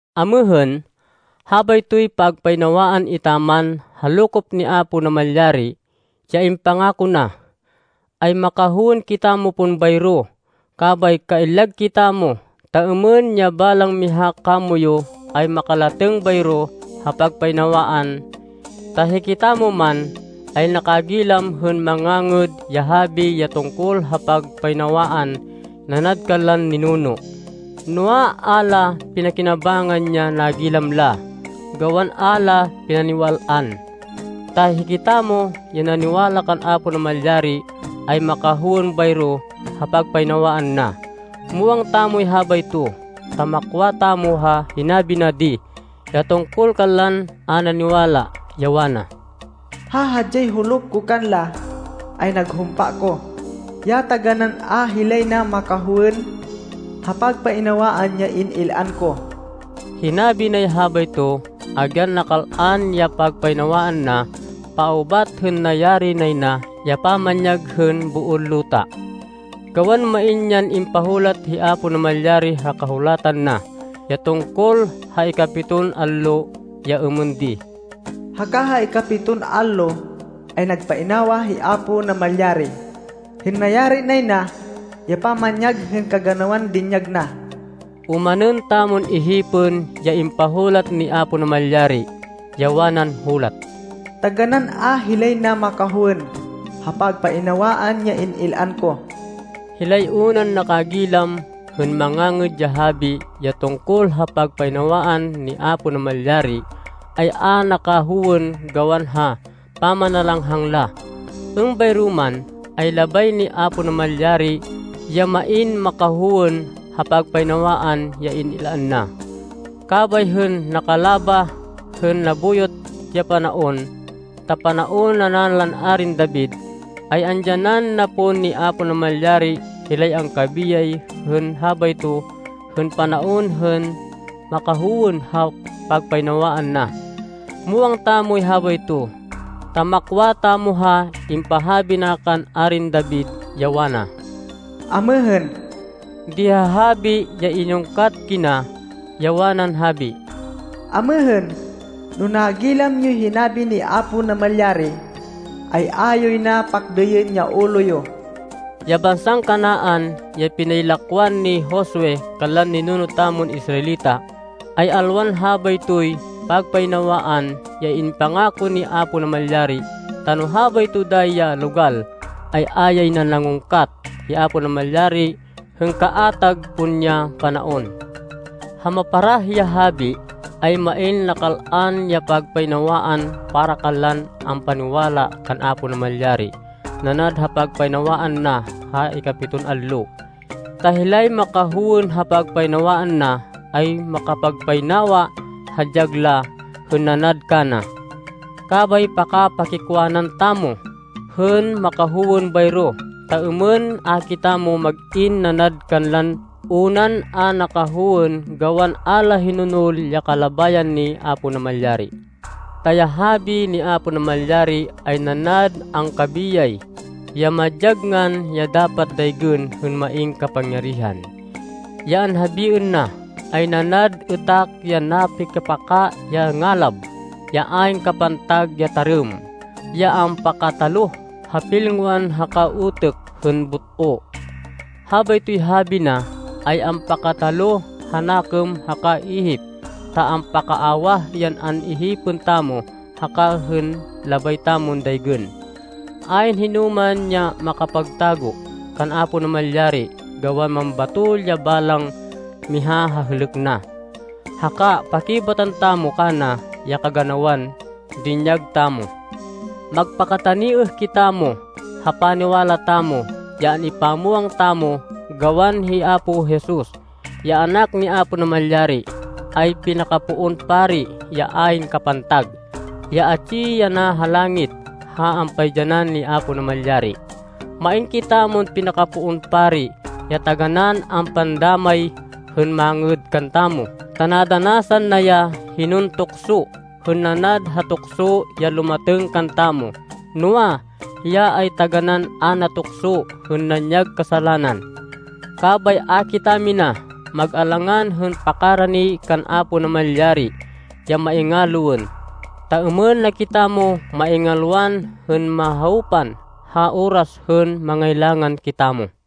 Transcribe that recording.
Amêhên, habaytoy pagpainawaan etaman ha lokop ni Apo Namalyari, ya impangako na, ay makahowên kitamo pon bayro. Kabay kaillag kitamo ta êmên ya balang miha kamoyu ay makalatêng bayro ha pagpainawaan. Ta hikitamo man, ay nakagilam hên mangangêd ya habi ya tungkol ha pagpainawaan nanad kanlan ninuno. Noa, a la pinakinabangnan ya nagilam la, gawan a la pinaniwal-an. Ta hikitamo ya naniwala kan Apo Namalyari, ay makahowên bayro ha pagpainawaan na. Muwang tamoy habayto, ta makwa tamo ha hinabi na di, ya tungkol kanlan a naniwala, ya wana, “Ha hadyay huluk ko kanla, ay naghumpa ko, ya taganán a hilay na makahowên ha pagpainawaan ya in-il-an ko.” Hinabi nay habayto, agyan nakal-an ya pagpainawaan na paubat hên nayari nay na ya pamanyag hên boon luta. Gawan main yan impahulat hi Apo Namalyari ha Kahulatan na ya tungkol ha ikapiton allo, ya êmên di, “Haka ha ikapiton allo ay nagpainawa hi Apo Namalyari hên nayari nay na ya pamanyag hên kaganawan dinyag na.” Omanên tamon ihipên ya impahulat ni Apo Namalyari, ya wanan hulat, “Taganán a hilay na makahowên ha pagpainawaan ya in-il-an ko.” Hilay unan nakagilam hên mangangêd ya habi ya tungkol ha pagpainawaan ni Apo Namalyari, ay a nakahowên gawan ha pamanalanghang la. Êmbayro man, ay labay ni Apo Namalyari ya main makahowên ha pagpainawaan ya in-il-an na. Kabay hên nakalabah hên nabuyot ya panaon, ta panaon ana lan Arin David, ay andyanan na pon ni Apo Namalyari hilay angkabiyay hên habayto hên panaon hên makahowên ha pagpainawaan na. Muwang tamoy habayto, ta makwa tamo ha impahabi na kan Arin David, ya wana, “Amêhên.” di ha habi ya inungkat kina, ya wanan habi, “Amêhên, no nagilam yoy hinabi ni Apo Namalyari, ay a yoy na pakdêyên ya ulo yo.” Ya bansan Canaan ya pinaylakwan ni Josue kanlan ninuno tamon Israelita, ay alwan habaytoy pagpainawaan ya impangako ni Apo Namalyari, ta no habayto dayi ya logal, ay a yay na nangungkat hi Apo Namalyari hên kaatag pon ya panaon. Ha maparah ya habi, ay main nakal-an ya pagpainawaan para kanlan ampaniwala kan Apo Namalyari nanad ha pagpainawaan na ha ikapiton allo. Ta hilay makahowên ha pagpainawaan na, ay makapagpainawa ha dyag la hên nanad kana. Kabay paka-pakikwanan tamo hên makahowên bayro, ta êmên a kitamo mag-in nanad kanlan unan a nakahowên gawan a la hinonol ya kalabayan ni Apo Namalyari. Ta ya habi ni Apo Namalyari, ay nanad angkabiyay, ya madyag ngan ya dapat daygên hên main kapangyarihan. Ya anhabiên na ay nanad êtak ya napikapaka ya ngalab, ya ayn kapantag ya tarêm, ya ampakataloh ha pilngoan haka utêk hên but-o. Habaytoy habi na ay ampakataloh ha nakêm haka ihip ta ampakaawah yan an-ihipên tamo haka hên labay tamon daygên. Ayn hinoman ya makapagtago kan Apo Namalyari, gawan mambatol ya balang miha ha hêlêk na, haka pakibatan tamo kana ya kaganawan dinyag tamo. Magpakataniêh kitamo ha paniwala tamo ya an-ipamwang tamo, gawan hi Apo Jesus, ya Anak ni Apo Namalyari, ay pinakapoon pari ya ayn kapantag, ya atsi yana ha langit ha ampaidyanan ni Apo Namalyari. Main kitamon pinakapoon pari ya taganán ampandámay hên mangêd kantamo ta nadanasan na ya hinon tukso hên nanad ha tukso ya lumatêng kantamo, noa, hiya ay taganán a natukso hên nanyag kasalanan. Kabay a kitamina mag-alangan hên pakarani kan Apo Namalyari ya maingaloên, ta êmên na kitamo maingalwan hên mahawpan ha oras hên mangailangan kitamo.